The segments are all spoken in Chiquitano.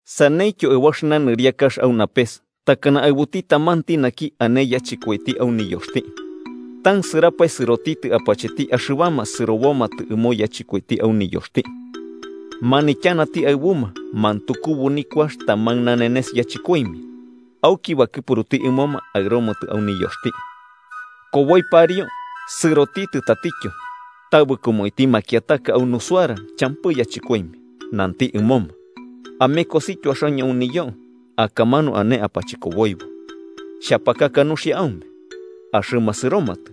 “Saneityo aɨbu axɨna nɨriakax au napes takana aɨbuti tamanti naki ane niyachɨkoiti au niyoxti, tansɨrapae sɨrotitɨ apacheti axɨbama sɨrobomatɨ ɨmo niyachɨkoiti au niyoxti. Manityanati aɨbuma mantukubu nikuax taman nanenes yachɨkoimia, auki bakɨpuruti ɨmoma aɨromatɨ au niyoxti. Koboi pariu sɨrotitɨ tatityo, tabɨkoma uiti makiataka au nusuara champɨ yachɨkoimia. Nanti ɨmoma: ‘Amekosityo axaño au niyo akamanu ane apachɨkoboibo, xhapakaka nuxia aume.’ Axɨma sɨromatɨ.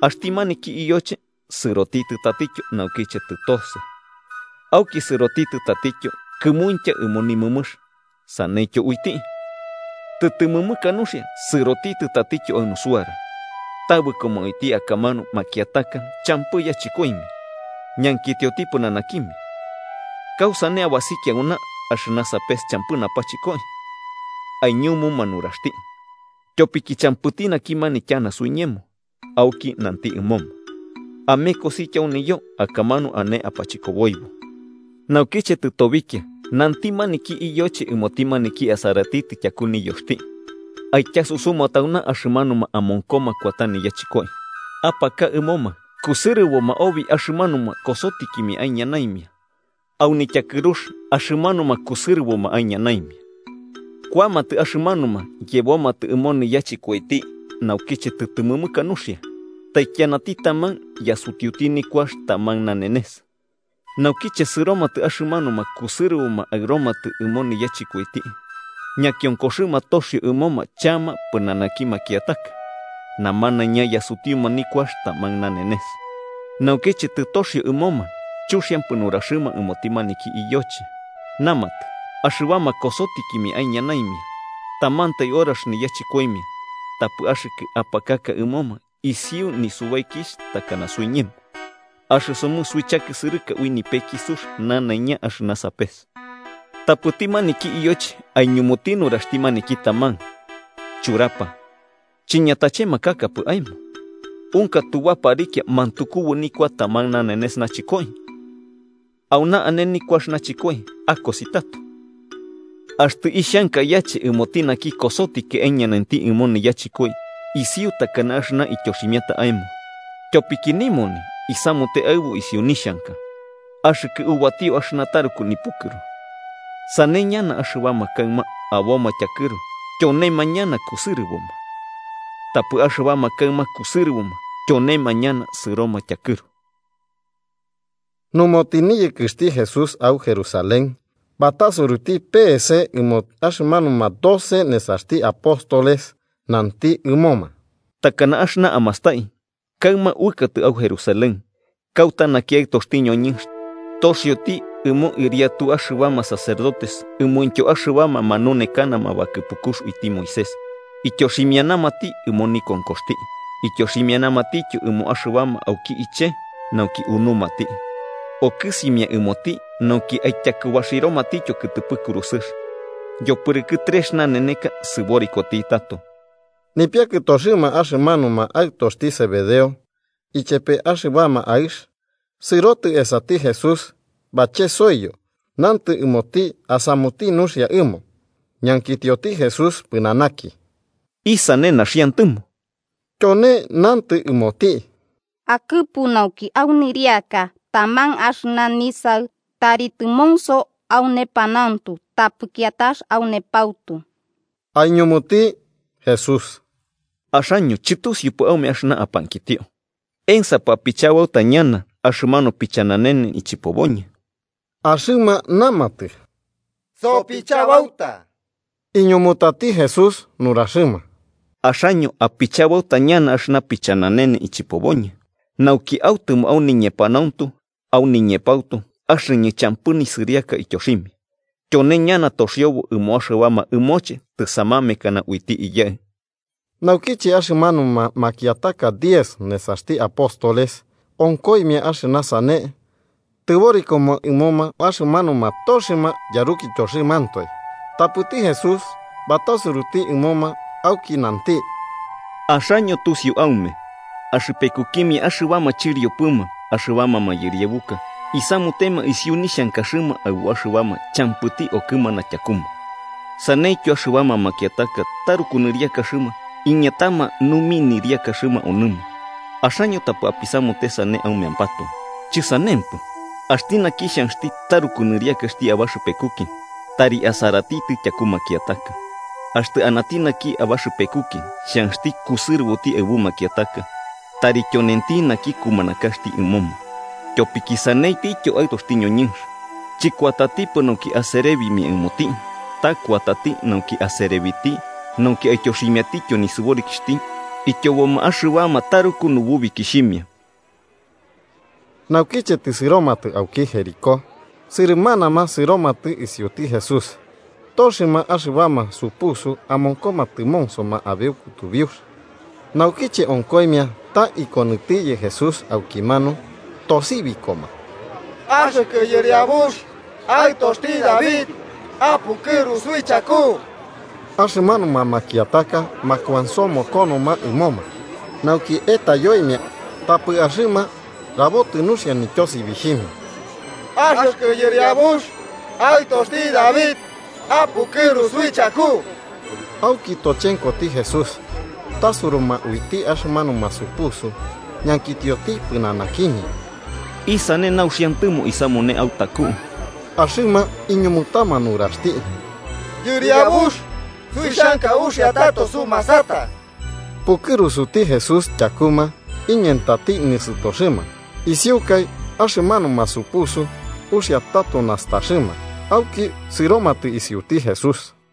Axti maniki iyoche sɨrotitɨ tatityo naukiche tɨtose, auki sɨrotitɨ tatityo kɨmuintya ɨmo nimɨmɨx, saneityo uiti. Tɨtɨmɨmɨka nuxia sɨrotitɨ tatityo au nusuara, tabɨkoma uiti akamanu makiataka champɨ yachɨkoimia. Ñankitioti pɨnanakimia: ‘¿Kausane abasikia auna axɨna sapes champɨ napachɨkoi?’ Aiñumuma nuraxti: ‘Tyopiki champɨti naki manityana suiñemo.’ Auki nanti ɨmoma: ‘Amekosityo au niyo akamanu ane apachɨkoboibo.’ “Naukiche tɨtobikia, nanti maniki iyoche ɨmoti maniki asaratitɨ tyaku niyoxti: ‘Aityasusuma tauna axɨmanuma amonkoma kuata niyachɨkoi, apaka ɨmoma kusɨrɨboma obi axɨmanuma kosotikimia aiñanaimia au nityakɨrux axɨmanuma kusɨrɨboma aiñanaimia.’ Kuamatɨ axɨmanuma, yebomatɨ ɨmo niyachɨkoiti naukiche tɨtɨmɨmɨka nuxia, taikianati taman yasutiuti nikuax taman nanenes. Naukiche, sɨromatɨ axɨmanuma kusɨrɨboma aɨromatɨ ɨmo niyachɨkoiti, ñakionkoxɨma toxio ɨmoma chama pɨnanaki makiataka. Namanaiña yasutiuma nikuax taman nanenes. Naukiche tɨtoxio ɨmoma, chuxiampɨ nuraxɨma ɨmoti maniki iyoche, namatɨ: ‘Axɨbama, kosotikimia aiñanaimia, tamantai horax niyachɨkoimia, tapɨ axɨkɨ apakaka ɨmoma isiu nisubaikixh takana suiñemo, axɨsomɨ suichakisɨrɨka ui nipeki sux nanaiña axɨna sapes.’ Tapɨti maniki iyoche aiñumuti nuraxti maniki taman: ‘Churapa, chiñatachemakakapɨ aemo. ¿Unka tubaparikia mantukubu nikua taman nanenes nachɨkoi? Auna ane nikuax nachɨkoi akosi tato. Axtɨ ixhanka yache ɨmoti naki kosotikiti aiñanainti ɨmo niyachɨkoi isiu takana axɨna ityoximiata aemo, tyopiki nimoni isamute aɨbu isiu nixhanka. ¿Axɨkɨ ubatio axɨna taruku nipukɨru?’ “Sane ñana axɨbama kaɨma aboma tyakɨru, tyonema ñana kusɨrɨboma. Tapɨ axɨbama kaɨma kusɨrɨboma, tyonema ñana sɨroma tyakɨru.” Numo, tɨniyɨkɨxti Jesús au Jerusalén, batasuruti peese ɨmo axɨmanuma doce nesaxti apóstoles nanti ɨmoma: 18–Takana axɨna amastai, kaɨma uɨkatɨ au Jerusalén, kauta naki Aɨtoxti ñoñɨnx taxioti ɨmo ɨriatu axɨbama sacerdotes ɨmointyo axɨbama manunekanama bakɨpukux uiti Moisés, ityoximianamati ɨmo nikonkoxti ityoximianamatityo ɨmo axɨbama auki iche nauki unumati, okɨsimia ɨmoti nauki aityakubaxiromatityo kɨtɨpɨ kurusɨx. Yopɨrɨkɨ trex naneneka sɨborikoti tato. Nipiakɨtoxɨma axɨmanuma aɨtoxti Zebedeo, ichepe axɨbama aɨx, sɨrotɨ esati Jesús bachesoiyo nantɨ ɨmoti asamuti nuxia ɨmo. Ñankitioti Jesús pɨnanaki: –¿Isane naxiantɨmo? Tyone nantɨ ɨmoti: –Akɨpu nauki au nɨriaka taman axɨna nisaɨ tari tɨmonso au nepanauntu tapɨ kiatax au nepautu. Aiñumuti Jesús: –Axaño chɨtusiupɨ aume axɨna apankitio. ¿Ensapɨ apichabauta ñana axɨmanu pichananene ichɨpoboñɨ? Axɨma namatɨ: –Sopichabauta. Iñumutati Jesús nuraxɨma: –Axaño apichabauta ñana axɨna pichananene ichɨpoboñɨ, nauki autɨmo au niñepanauntu au niñepautu axɨñɨ champɨ nisɨriaka ityoximia, tyone ñana toxiobo ɨmo axɨbama ɨmoche tɨsamamekanama uiti Iyaɨ. Naukiche axɨmanuma makiataka diez nesaxti apóstoles onkoimia axɨna sane, tɨborikoma ɨmoma axɨmanuma toxɨma yarukityoxɨmantoe. Tapɨti Jesús batasuruti ɨmoma auki nanti: –Axaño tusiu aume, axɨpekukimia axɨbama chɨriopɨma axɨbama mayɨriabuka isamutema isiu nixhankaxɨma aɨbu axɨbama champɨti okɨmana tyakuma, saneityo axɨbama makiataka taruku nɨriakaxɨma iñatama numi nɨriakaxɨma onɨma. Axaño tapɨ apisamute sane aumeampatoe. Chisanempɨ, axti naki xhanxti taruku nɨriakaxti abaxɨpekuki, tari asaratitɨ tyaku makiataka. Axtɨ anati naki abaxɨpekuki xhanxti kusɨrɨboti aɨbu makiataka, tari tyonenti naki kumanakaxti ɨmoma. Tyopiki, sanentityo Aɨtoxti ñoñɨnx, chɨkuatatipɨ nauki aserebimia ɨmoti, ta kuatati nauki aserebiti nauki aityoximiatityo nisɨborikixhti ityoboma axɨbama taruku nububikixhimia. Naukiche tɨsɨromatɨ auki Jericó, sɨrɨmanama sɨromatɨ isiuti Jesús. Toxɨma axɨbama supusuma amonkoma tɨmonsoma abeu kutubiux, naukiche onkoimia ta ikonɨtiyɨ Jesús aukimanu, tosibikoma: –¡Axɨkɨ Yɨriabux, Aɨtoxti David, apukɨru suichaku! Axɨmanuma makiataka makuansomokonoma ɨmoma nauki etayoimia, tapɨ axɨma rabotɨ nuxia nityosibixhimia: –¡Axɨkɨ Yɨriabux, Aɨtoxti David, apukɨru suichaku! Auki tochenkoti Jesús, tasuruma uiti axɨmanuma supusu ñankitioti pɨnanakimia: –¿Isane nauxiantɨmo isamune autaku? Axɨma iñumutama nuraxti: –Yɨriabux, suixhanka uxia tato sumasata. Pukɨrusuti Jesús tyakuma, iñentati nisɨtoxɨma. Isiukai axɨmanuma supusu uxia tato nastaxɨma, auki sɨromatɨ isiuti Jesús.